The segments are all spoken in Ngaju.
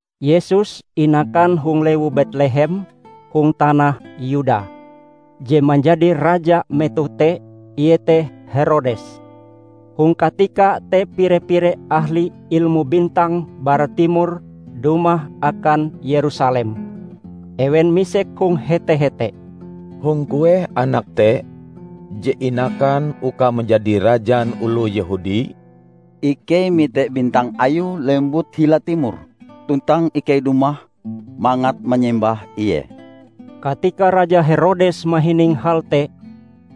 Yesus inakan hong lewu Betlehem hong tanah Yuda; je manjadi raja metoh te iete Herodes. Hong katika te pire-pire ahli ilmu bintang bara timor dumah akan Yerusalem. Ewen misek hong hete-hete, "Hong kueh Anak te, je inakan uka manjadi Rajan oloh Yehudi? Ikei mite bintang Ayue lembut hila timor, tuntang ikei dumah mangat manyembah Ie." Katika Raja Herodes mahining hal te,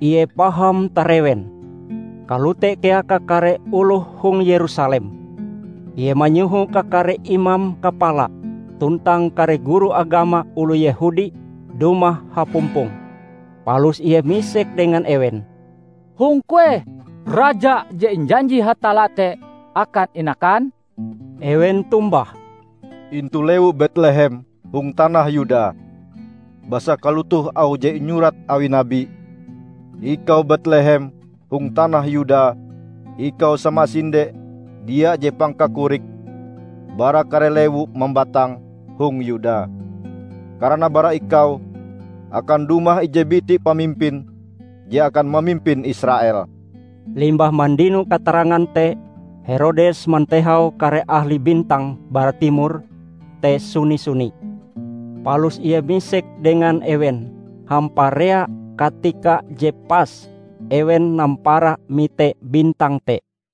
ie paham tarewen, kalote kea kakare oloh hong Yerusalem. Ie manyoho kakare imam kapala tuntang kare guru agama oloh Yehudi dumah hapumpong. Palus ie misek dengan ewen, "Hong kueh Raja je injanji Hatalla te akan inakan?" Ewen tombah, "Intu Lewu Betlehem hong tanah Yuda. Basa kalotoh auh je inyurat awi nabi, 'Ikau Betlehem hong tanah Yuda ikau samasinde dia je pangkakorike bara kare lewu mambatang hong Yuda. Karana bara ikau akan dumah ije biti pamimpin je akan mamimpin Israel.' " Limbah mandino katarangan te, Herodes mantehau kare ahli bintang bara timor te suni-suni. Palus ie misek dengan ewen hamparea katika je pas ewen nampara mite bintang te.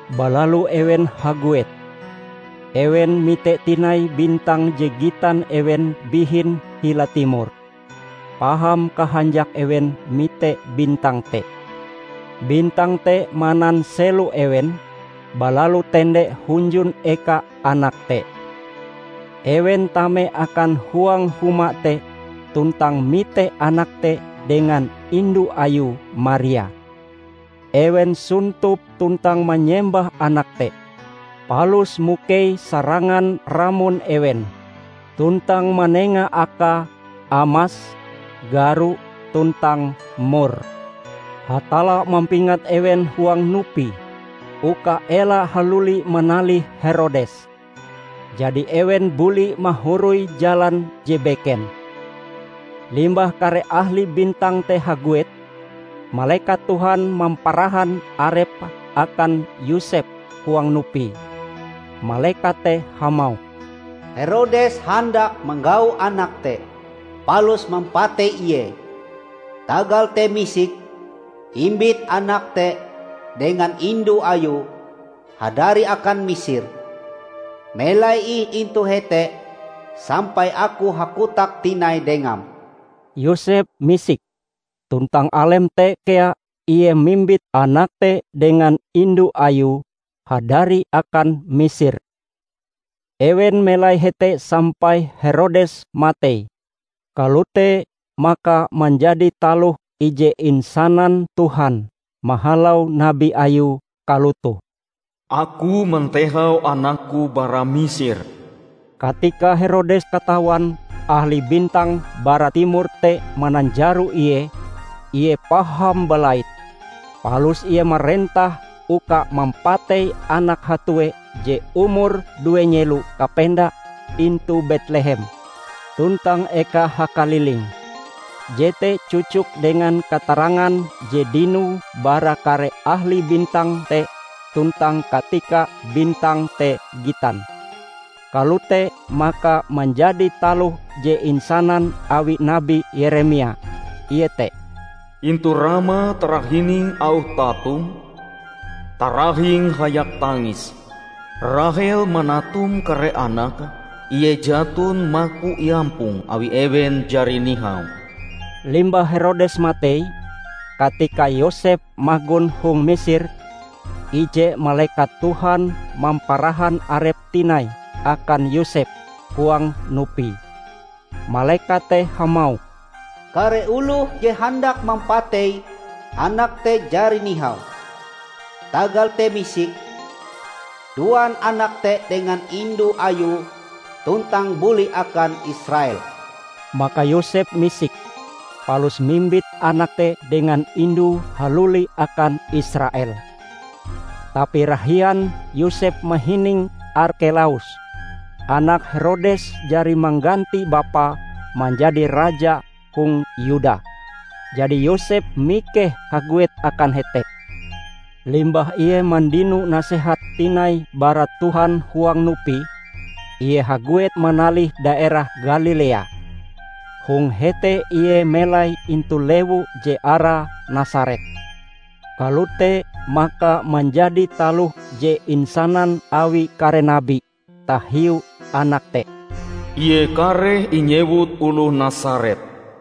Balalu ewen haguet. Ewen mite tinai bintang je gitan ewen bihin hila timor. Paham kahanjak ewen mite bintang te! Bintang te mananselo ewen, balalu tende hunjun eka Anak te. Ewen tame akan huang huma te tuntang mite Anak te dengan indu Ayue Maria. Ewen sontop tuntang manyembah Anak te, palus mukei sarangan ramon ewen, tuntang manenga Akae amas, garo, tuntang mor. Hatalla mampingat ewen huang nupi uka ela haluli manalih Herodes. Jadi ewen buli mahoroi jalan je beken. Limbah kare ahli bintang te haguet, malekat Tuhan mamparahan arepe akan Yosep huang nupi. Malekat te hamauh, "Herodes handak manggau Anak te palus mampatei Ie. Tagal te misik, imbit Anak te dengan indu Ayue hadari akan Misir. Melai ih intu hete sampai Aku hakotak tinai dengam." Yosep misik, tuntang alem te kea ie mimbit Anak te dengan indu Ayue hadari akan Misir. Ewen melai hete sampai Herodes matei. Kalote maka manjadi taloh ije insanan Tuhan mahalau nabi Ayue kalotoh, "Aku mantehau anak-Ku bara Misir." Katika Herodes katawan ahli bintang bara timor te mananjaro ie, ie paham balait. Palus ie marentah uka mampatei anak hatue je umure due nyelo kapenda intu Betlehem tuntang eka hakalilinge. Jete cocok dengan katarangan je dinoe bara kare ahli bintang te tuntang katika bintang te gitan. Kalote maka manjadi taloh je insanan awi Nabi Yeremia, iete, "Intu Rama tarahining auh tatum, tarahing hayak tangis. Rahel manatum kare anake ie jaton maku iampong awi ewen jari nihau." Limbah Herodes matei, katika Yosep magon hong Misir, ije malekat Tuhan mamparahan arepe tinai akan Yosep huang nupi. Malekat te hamauh, "Kare oloh je handak mampatei Anak te jari nihau. Tagal te misik, duan Anak te dengan indu Ayue tuntang buli akan Israel." Maka Yosep misik, palus mimbit Anak te dengan indue haluli akan Israel. Tapi rahian Yosep mahining Arkelaus, anak Herodes jari mangganti bapae manjadi raja hong Yuda. Jadi Yosep mikeh haguet akan hete. Limbah ie mandino Nasehat tinai bara Tuhan huang nupi, ie haguet manalih daerah Galilea. Hong hete ie melai intu lewu je arae Nasaret. Kalote maka manjadi taloh je insanan awi kare nabi tahiu anak te: "Ie kareh inyewut Oloh Nasaret."